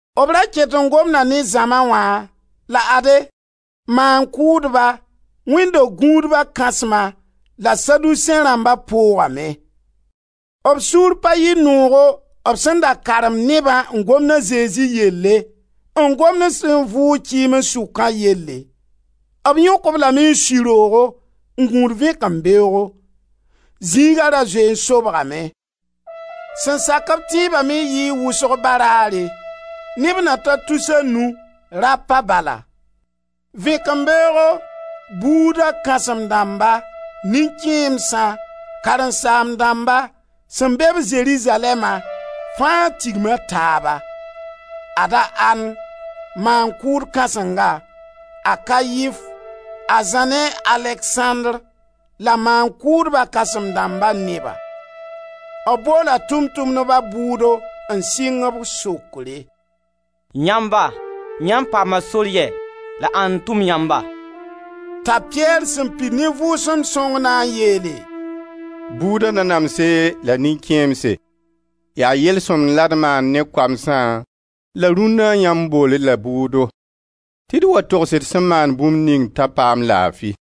B ra ket n gomda ne zãma wã la ade, Maan-kʋʋdba, wẽnd do-gũuba kãsma la Saduseẽ rãmba poogame. B sũur pa yɩ noogo b sẽn da karemd nebã n gomd a Zezi yelle, n gomd b sẽn vʋʋg kɩɩms sʋkã yelle. B yõk-b lame n sui roogo n gũud vẽkembeoogo. Zĩiga ra zoe n sobgame. Sẽn sak-b tẽeba me yɩɩ wʋsg baraare, neb na ta tus a nu, rapa bala. Vẽkembeoogo buuda kãsem-dãmba, nin-kẽemsã, karen-saam-dãmba sẽn be-b Zerizalɛɛma, fãa tigma taaba. Ad-a An, maan-kʋʋd kãsenga, a Kaif, a Zã ne a Aleksãndr, la maan-kʋʋdba kãsem-dãmba neba. B boola Tʋʋm-tʋmdba bʋʋdo n sɩng b sokre: «Yãmba, yãmb paama sor yɛ la ãnd n tʋm yãmba?» T'a Piyɛr sẽn pid ne Vʋʋsem Sõng na n yeele: «Buuda nanamse la nin-kẽemse, yaa yel-sõmd la d maan ne koamsã la rũnna, yãmb bool-d la bʋʋdo, tɩ d wa togs d sẽn maan bũmb ning t'a paam laafi.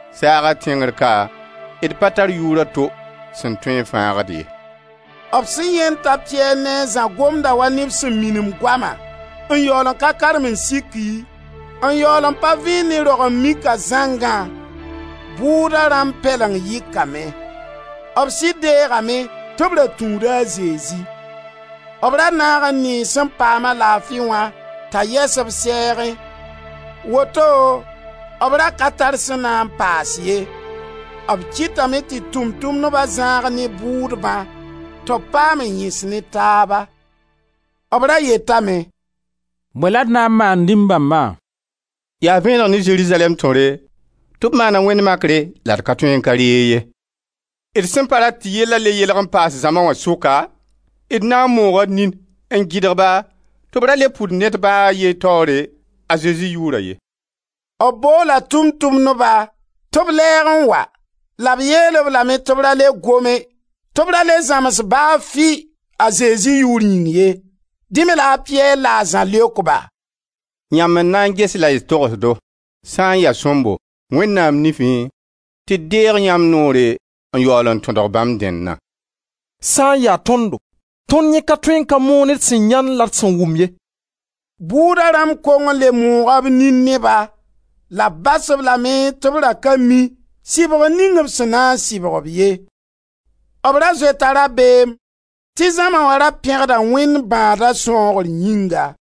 Saaga tẽngr ka, d pa tar yʋʋr a to sẽn tõe n fãag-d ye.» B sẽn yãend t'a Piyɛr ne a Zã gomda wa neb sẽn minim goama, n yaool n ka karem n siki, n yaool n pa vẽen ne rog-n-mika zãngã, bʋʋda rãmb pɛleng yɩkame. B sɩd deegame tɩ b ra tũuda a Zezi. B ra naag n nee sẽn paam-a laafi wã t'a yɛs b sɛɛgẽ, woto b ra ka tar sẽn na paas ye. B kɩtame tɩ Tʋʋm-tʋmdba zãag ne bʋʋdbã, tɩ b paam n yẽs ne taaba. B ra yetame: «Bõe la d na n maan nin-bãmba? Yaa vẽeneg ne Zerizalɛɛm tõre tɩ b maana wẽnd makre la d ka tõe n ka reeg ye. D sẽn pa rat tɩ yella le yelg n paas zãma wã sʋka, d na n mooga d nin n gɩdg-ba tɩ b ra le pʋd ned ba a ye taoore, a Zezi yʋʋra ye.» B boola Tʋʋm-tʋmdba tɩ b lɛɛg n wa, la b yeel-b lame tɩ b ra le gome, tɩ b ra le zãms ba fɩ a Zezi yʋʋr yĩng ye. Dẽ me la a Piyɛr la a Zã leok-ba: «Yãmb n na n ges la y togs do sã n ya sõmbo Wẽnnaam nifẽ tɩ d deeg yãmb noore n yaool n tõdg bãmb dẽnna? Sã n ya tõndo, tõnd yẽ ka tõe n ka moon d sẽn yãend la d sẽn wʋm ye.» Bʋʋda rãmb kong n le mooga b nin ne-ba, la b bas-b lame tɩ b ra ka mi sɩbgr ning b sẽn na n sɩbg-b ye. B ra zoeta rabeem tɩ zãma wã ra pẽgda Wẽnd, bãada sãoogr yĩnga.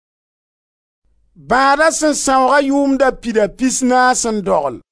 Bãada sẽn sãoogã yʋʋm da pida pisnaas n dogl.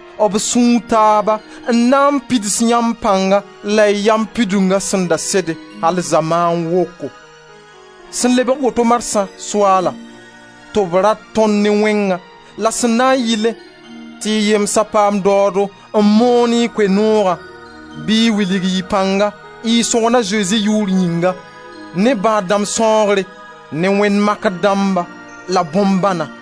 b sũu taaba n na n pids yãmb pãnga la y yam pidunga sẽn da sede al zamaan woko. Sẽn lebg woto marsã, Soaala, tɩ b rat tõnd ne wẽngã, la sẽn na n yɩlẽ tɩ y yemsa paam daoodo n moon y Koe-noogã, bɩ y wilg y pãnga, y Sõgna Zezi yʋʋr yĩnga, ne bãad-dãmb sãoogre, ne wẽnd makr dãmba la bõn-bãna.»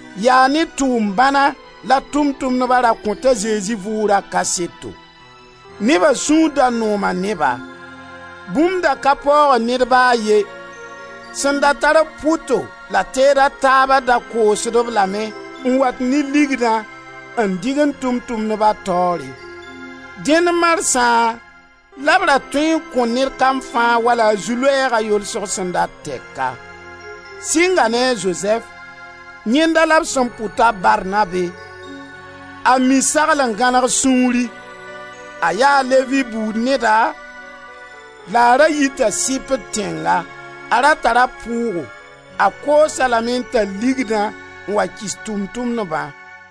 Yaa ne tʋʋm bãna la Tʋʋm-tʋmdba ra kõt a Zezi vʋʋgra kaseto. Neba sũur da nooma ne-ba. Bũmb da ka paoogd ned ba a ye. Sẽn da tar-b pʋto la teed a taaba da koosd-b lame n wat ne ligdã n dɩgend Tʋʋm-tʋmdba taoore. Dẽn marsã la b ra tõe n kõ ned kam fãa wala a zu-loɛɛga yolsg sẽn dat tɛka. Sɩnga ne a Zozɛf; yẽnda la b sẽn pʋd t'a Barnabe, a mi sagl n gãneg sũuri; a yaa Levi buud neda la a ra yita Sɩpr tẽnga. A ra tara pʋʋgo, a koos-a lame n tall ligdã n wa kɩs Tʋʋm-tʋmdbã.